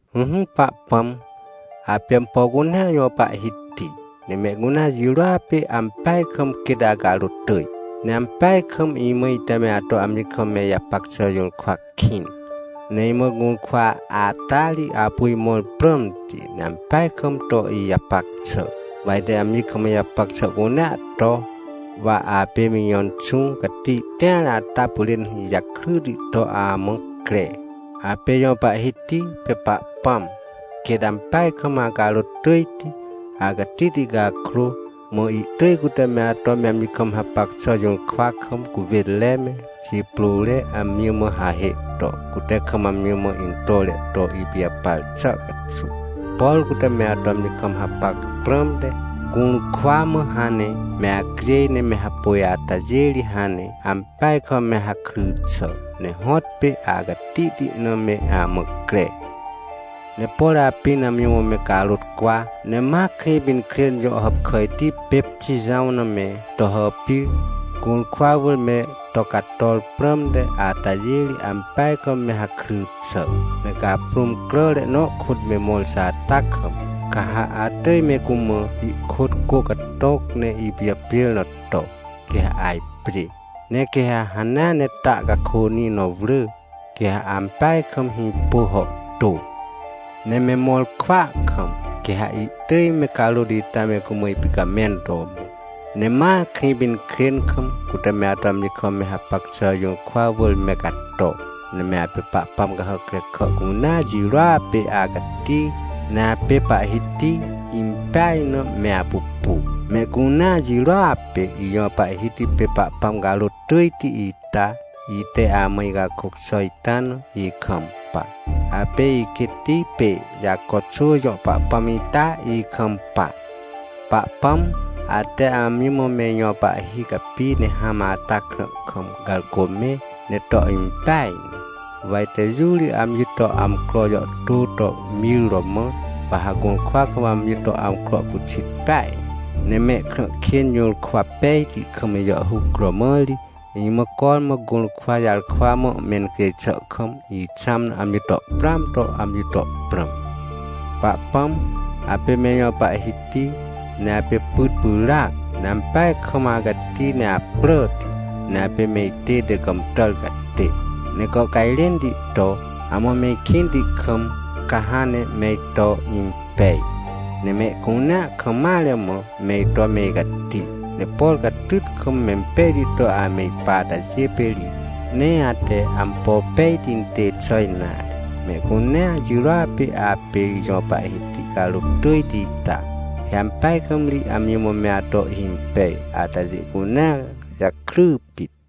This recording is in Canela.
Ỹhỹ Pahpãm, apê ampo cunea jõ Pahhiti, ne mehcunea jirôa pê ampeaj kam quêt acarôt tỳj. Ne ampeaj kam imã ite me ato amji kam me ijapac xà jũrkwa kĩn. Ne imã gũrkwa ata ri apu imõr prãmti, ne ampeaj kam to ijapac xà. Wa ite amji kam ijapac xà cunea to, wa apê me ijõ Inxũ Cati tĩar ata pyrên ijakryti to amã cre. Apê ijõ Pahhiti pê Pahpãm! Quêt ampeaj kam acarôt tỳjti! Acatihti cakrô, mã ihtỳj cute me ato me amji kam hapac xà jũrkwa kam cuwênre me, xiprôre amji mã hahê to, cute kam amji mã intore to ipijapar xà caxuw. Por cute me ato amji kam hapac prãmte, gũrkwa mã hãn ne me acjêj, ne me hapôj atajê ri hãn ne ampeaj kam me hakry xà, ne hõtpê acatihti na me amã cre! Ne por apĩn amji mã me carôt cwa, ne ma Krĩpinkrên jõ hàpkàjti pê Xijãw na me to hàpir, gũrkwa wỳr me to cator prãmte atajê ri, ampeaj kam me hakry xà. Ne caprũm cràre nõ kôt me mõr xà ata kam, ca ha atỳj me cumã ihkôt cô catõc ne ipijapjêr na to, quê ha ajpjê. Ne quê ha hanea ne ta cakônĩ nõ wrỳ, quê ha ampeaj kam hĩpô hàhtô. Ne me mõr kwỳa kam, quê ha ihtỳj me carôt ita me cumã ipicamẽn to mõ. Ne ma Krĩpinkrên kam, cute me ato amji kam me hapac xà jũrkwa wỳr me cato, ne me apê pahpãm cahàc krekà cunea jirôa pê acati ne apê Pahhiti impeaj na me apupu. Mehcunea jirôa pê ijõ Pahhiti pê Pahpãm carôt tỳjti ita, ite amã icakôc xà ita na, ikampa. Apê iquêtti pê Jaco xwỳ jõ Pahpãm ita, ikampa. Pahpãm, ate amji mã me ijõ pahhi capi ne hãm ata krã kam garcô mẽ, ne to impeaj ne. Wa ite jũ ri amji to amcro jàhtô to mir romã, wa ha gũrkwa kam amji to amcro pyxit peaj. Ne mehkrã kên jũrkwa pejti kam ijàhhuc romã ri, imã cormã gũrkwa jarkwa mã mencjêj xà kam ixãm na amji to prãam to amji to prãm. Pahpãm, apê me ijõ Pahhiti, ne apê pyt pyràac, ne ampeaj kam acati ne apràti, ne apê me itête gàmtàr catê. Ne gàhcajrẽnti to, amã me ikĩnti kam, ca hãn ne me ito impej, ne mehcunea kam mare mã me ito me icati. Ne por catyt kam, mempejti to ame ipa atajê pê ri, nee ate ampo pejti intê xà nare. Mehcunea jirôa pê apê ijõ Pahhiti carôt tỳjti ita. He ampeaj kam ri amji mã me ato ihhimpej atajê cunea jakry pit.